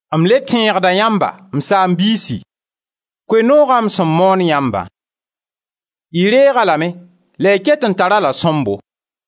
M le tẽegda yãmba, m saam-biisi, Koe-noogã m sẽn moon yãmbã; y reeg-a lame la y ket n tar-a-la sõmbo.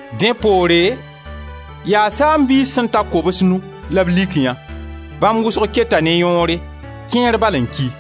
dẽ poore yaa saam-biis sẽn ta kobs-nu la b lik yã — bãmb wʋsg keta ne yõore, kẽer bal n ki —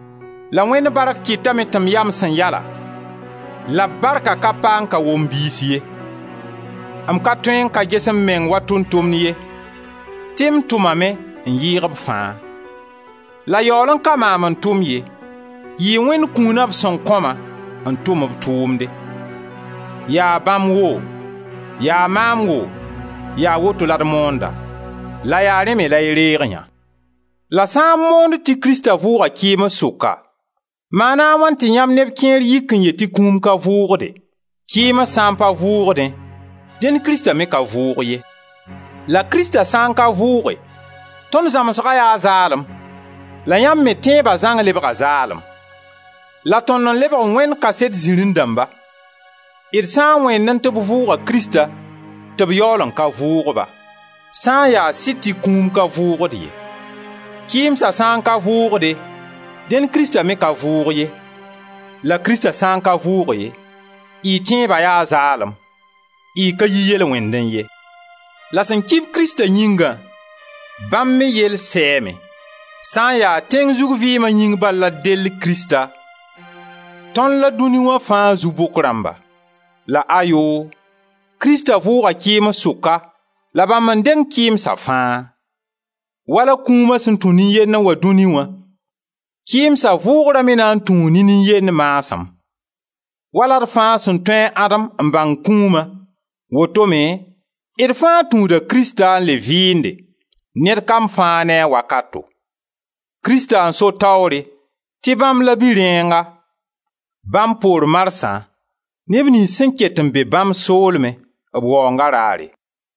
La Wẽnd bark kɩtame tɩ m ya m sẽn ya-lã la b barkã ka pa n ka wom a biis ye. M ka tõe n ka ges m meng wa tʋʋm-tʋmd ye, tɩ m tʋmame n yɩɩg b fãa; la yaool n ka maam n tʋm ye, yɩ Wẽnd kũuna b sẽn kõ-ma n tʋm b tʋʋmde. Yaa bãmb woo, yaa maam woo, yaa woto la d moonda. La yaa rẽ me la y reeg yã. La sã n moond tɩ Krista vʋʋga kɩɩms sʋka, maana a wãn tɩ yãmb neb kẽer yik n yet tɩ kũum ka vʋʋgde? Kɩɩms sã n pa vʋʋgdẽ, dẽn Krista me ka vʋʋg ye. La Krista sã n ka vʋʋge, tõnd zãmsga yaa zaalem la yãmb me tẽeba zãng lebga zaalem. La tõnd n lebg Wẽnd kaset zirẽ-dãmba, d sã n wẽennẽ tɩ b vʋʋga Krista, tɩ b yaool n ka vʋʋg-ba, sã n ya sɩd tɩ kũum ka vʋʋgd ye. Kɩɩmsa sã n ka vʋʋgde, dẽn Krista me ka vʋʋg ye. La Krista sã n ka vʋʋge, y tẽeba yaa zaalem; y ka yi yel-wẽndẽ ye, la sẽn ki-b Krista yĩngã, bãmb me yell sɛɛme. Sã n ya tẽng zug vɩɩma yĩng bal la d del Krista, tõnd la dũni wã fãa zu-bʋk rãmba. La ayoo! Krista vʋʋga kɩɩms sʋka, la bãmb n deng kɩɩmsa fãa. Wala kũuma sẽn tũ nin-yend n wa dũni wã, kɩɩmsa vʋʋgra me na n tũu ne nin-yend maasem. Wala d fãa sẽn tũud a Adem n bãng kũuma, woto me d fãa tũuda Krista n le vɩɩnde, ned kam fãa ne a wakato: Krista n so taoore, tɩ bãmb la Bi-rẽenga. Bãmb poor marsã neb niyns sẽn ket n be bãmb soolmẽ, b waoonga raare.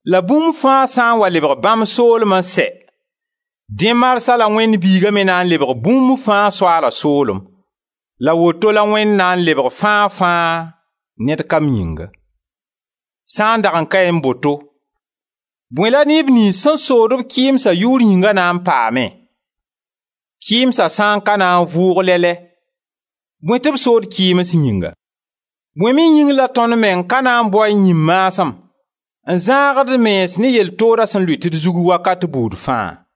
La bũmb fãa sã n wa lebg bãmb soolem n sɛ, dẽ marsã la Wẽnd Biiga me na n lebg bũmb-fãa-Soaala-soolem, la woto la Wẽnd na n lebg fãa-fãa ned kam yĩnga. Sã n dag n kaẽ boto, bõe la neb niyns sẽn sood-b kɩɩmsa yʋʋr yĩnga na n paamẽ? Kɩɩmsa sã n ka na n vʋʋg lɛ-lɛ, bõe tɩ b sood kɩɩms yĩnga? Bõe me yĩng la tõnd meng ka na n baoẽ yĩn-maasem n zãag d mens ne yɛl tooda sẽn lʋɩt d zug wakat buud fãa?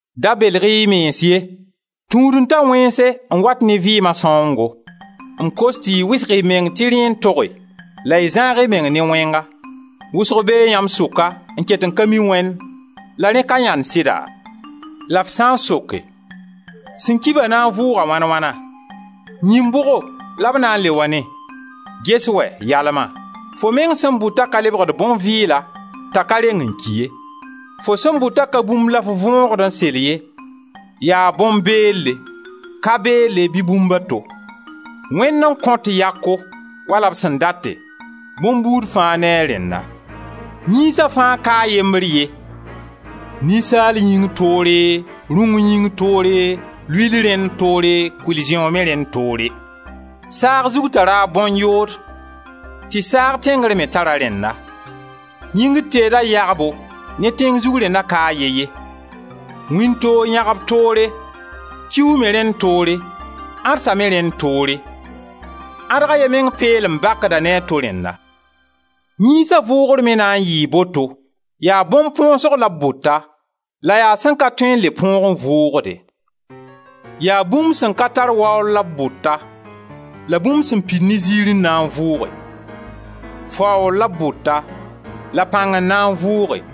Da belg-y y mens ye: Tũud-n-ta wẽnse n wat ne vɩɩma sãoongo. M kos tɩ y wɩsg y meng tɩ rẽ n toge la y zãag y meng ne wẽnga. Wʋsg bee yãmb sʋka n ket n ka mi Wẽnd, la rẽ ka yãnd sɩda? La f sã n soke: Sẽn ki-ba na n vʋʋga wãn wãna? Yĩin bʋgo la b na n le wa ne? Ges wɛ, yalma, fo meng sẽn bʋtã ka lebgd bõn-vɩɩla t'a ka reng n ki ye. Fo sẽn bʋta ka bũmb la f võogd n sel ye, yaa bõn-beelle, ka-beelle, bɩ bũmb a to. Wẽnd n kõt yako wala b sẽn date, bõn-buud fãa ne a rẽnna. Yĩnsa fãa ka a yembr ye: ninsaal yĩng toore, rũng yĩng toore, luiil rẽnd toore, kʋɩl-zẽoog me rẽnd toore. Saag zug tara a bõn-yood, tɩ saag tẽngr me tar a rẽnna. Yĩngr teeda yãgbo ne tẽng zug rẽnna ka a ye ye. Wĩntoog yãgb toore, kiuug me rẽnd toore, ãdsa me rẽnd toore. Ãdg a ye meng peelem bakda ne ãdg a to rẽnna. Yĩnsa vʋʋgr me na n yɩɩ boto. Yaa bõn-põosg la b bʋta la yaa sẽn ka tõe n le põog n vʋʋgde. Yaa bũmb sẽn ka tar waoor la b bʋta, la bũmb sẽn pid ne ziir n na n vʋʋge; faoor la b bʋta, la pãng n na n vʋʋge;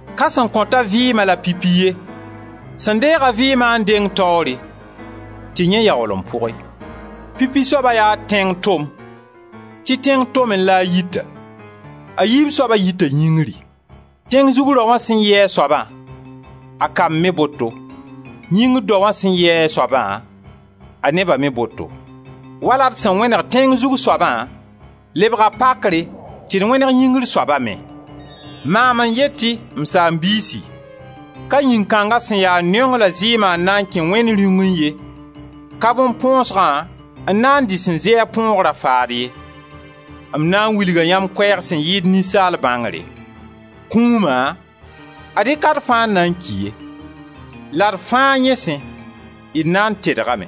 Ka sẽn kõt-a vɩɩma la pipi ye, sẽn deeg-a vɩɩma n deng taoore tɩ yẽ yaool n pʋge. Pipi soaba yaa tẽng tom, tɩ tẽng tomẽ la a yita; a yiib soaba yita yĩngri. Tẽng zug raoã sẽn yɩ a soaba, a kamb me boto, yĩngr daoã sẽn yɩ a soaba, a neba me boto. Wala d sẽn wẽneg tẽng zug soabã, lebga pakre tɩ d wẽneg yĩngr soaba me. Maam n yet-y, m saam-biisi, ka yĩn-kãnga sẽn ya neong la zɩɩma n na n kẽ Wẽnd Rĩungẽ ye, ka bõn-põosgã n na dɩ sẽn zɩ a põogra faad ye. M na n wilga yãmb koɛɛg sẽn yɩɩd ninsaal bãngre: Kũuma, ad-y ka d fãa n na n ki ye; la d fãa yẽ sẽ, d na n tedgame.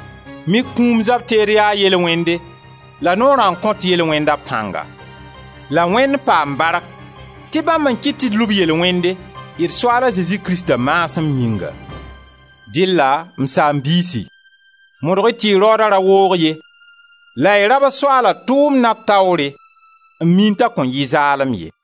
Mik kũum zab-teed yaa yel-wẽnde la Noorã n kõt yel-wẽnda pãngã. La Wẽnd paam bark tɩ bãmb n kɩt tɩ d lub yel-wẽnde, d Soaala Zezi Krista maasem yĩnga. Dɩlla, m saam-biisi, modg-y tɩ y raooda ra woog ye la y rabs Soaala tʋʋmna taoore n miẽ t'a kõn yɩ zaalem ye.